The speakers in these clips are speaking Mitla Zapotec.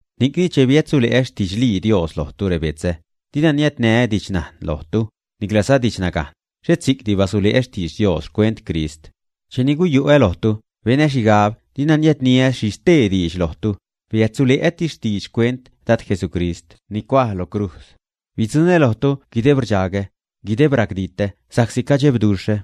Ni'cni cheni biädsule'ä xtidxlii Dios lojtu, rebetzä, dina niädniä didxnajn lojtu, niclaza didxnagajn, xhet si'cti basule'ä xtidx Dios xcuent Crist. Cheni guyu'ä lojtu, benä xhigab dina niädniä xhi stee diidx lojtu, biädsule'ätis diidx xcuent Dad Jesucrist, ni cuaj lo crujz. Bidzuṉä lojtu guideb rdxagä, guideb racditä sa'csi cadxebduxhä.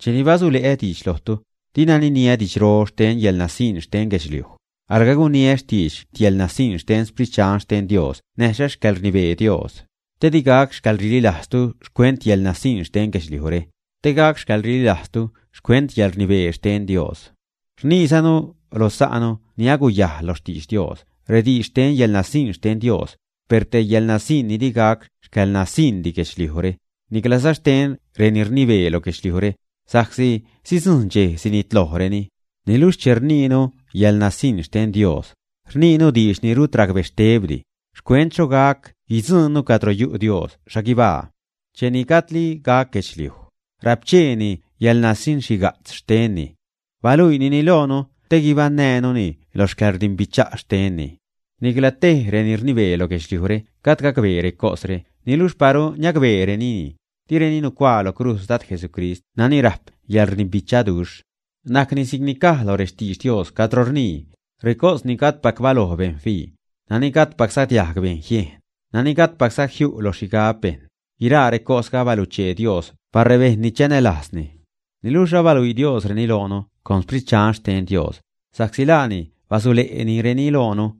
Cheni basule'ä diidx lojtu, dina niniä didxro xten yäḻnasiṉ xten guedxliuj, alga guniä xtiidx yäḻnasiṉ xten Sprit Dxan xten Dios näjza xcäḻrnibee Dios, te di gac xcäḻrililajztu xcuent yäḻnasiṉ xten guedxliujre, te gac xcäḻrililajztu xcuent yäḻrnibee xten Dios. Rniizanu lo sa'nu ni aguyajl lo xtidx Dios rediidx xten yäḻnasiṉ xten Dios, per te yäḻnasiṉ ni di gac xcäḻnasiṉdi guedxliuj, niclaza xten reni rnibee lo guedxliujre, sa'csi sidzujṉ dxej sinitlojreni. Niluxh che rniinu yäḻnasiṉ xten Dios, rniinu diidx ni rut racbextebdi, xcuent xho gac guidzuṉnu cadro yu' Dios xhaguibaa. Cheni gajdli gac guedxliuj, rapcheeni yäḻnasiṉxhiga'tz xtenni. Baluiinini loonu te guibaṉnäänuni lo xcäḻrdimbicha' xtenni. Nicla tej reni rnibee lo guedxliujre gajd gacbee recosre niluxh paru niacbeerenini, direni nucuaa lo crujz Dad Jesucrist nani rajp xcäḻrdimbichaduxh. Najcni si'cni caj lo rextidx Dios cadro rnii: Recos ni gajdpac baloj bejṉ fii, nani gajdpacza diajg bejn jiejn; nani gajdpacza jiu' lo xhigab bejṉ, guiraa recosga abaluchee Dios par rebejṉ ni chanälajzni. Niluxh abaluii Diosreni loonu con Sprit Dxan xten Dios, sa'csi laani basule'nireni loonu.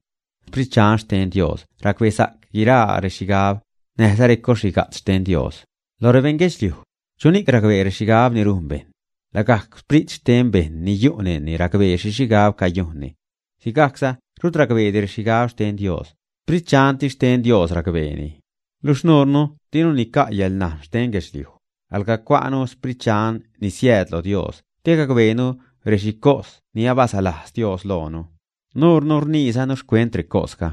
Sprit Dxan xten Dios racbesa'c guiraa rexhigab, näjza recos xhiga'tz xten Dios. Loj rebeṉ guedxliuj ¿chuni'c racbee rexhigab ni rujn bejṉ? Lagajc sprit xten bejṉ ni yu' neṉni racbee xhi xhigab cayujnni. Sigajcza rut racbeedi rexhigab xten Dios; Sprit Dxantis xten Dios racbeeni. Luxh nuurnu dinu nica' yäḻnajn xten guedxliuj, alga cua'nu Sprit Dxan ni siääd lo Dios te gacbeenu rexhicos ni abasalajz Dios loonu. Nuurnu rniizanu xcuent recosga,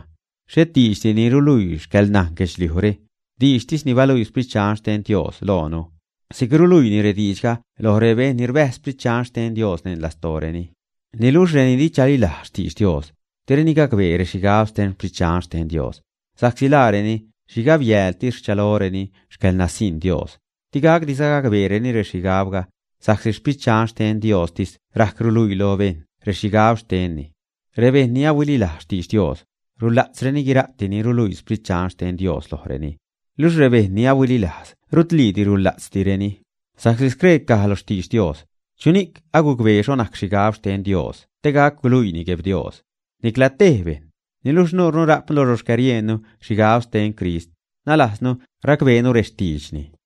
xhet diidxdi ni ruluii xcäḻnajn guedxliujre, diidxtis ni baluii Sprit Dxan xten Dios loonu. Si'c ruluiinu rediidxga loj rebejṉ ni rbäjz Sprit Dxan xten Dios neṉ lastooreni. Niluxh reni di chalilajz xtidx Dios, direni gacbee rexhigab xten Sprit Dxan xten Dios, sa'csi laareni xhigabyäältis rchaloreni xcäḻnasiṉ Dios. Di gacdiza gabeereni rexhigabga, sa'csi Sprit Dxan xten Diostis rajc ruluii lo bejṉ rexhigab xtenni. Rebejṉ ni ahuililajz xtidx Dios, rula'tzreni guira'ti ni ruluii Sprit Dxan xten Dios lojreni. Luxh rebejṉ ni ahuililajz rutliidi rula'tzdireni. Sa'csi scree caj lo xtidx Dios: “¿Chuni'c agucbee xho najc xhigab xten Dios te gac guluiini Gueb Dios, ä?” Nicla tej bejṉ. Niluxh nuurnu rajpnu lo xcäriejnnu xhigab xten Crist, nalajznu racbeenu rextiidxni.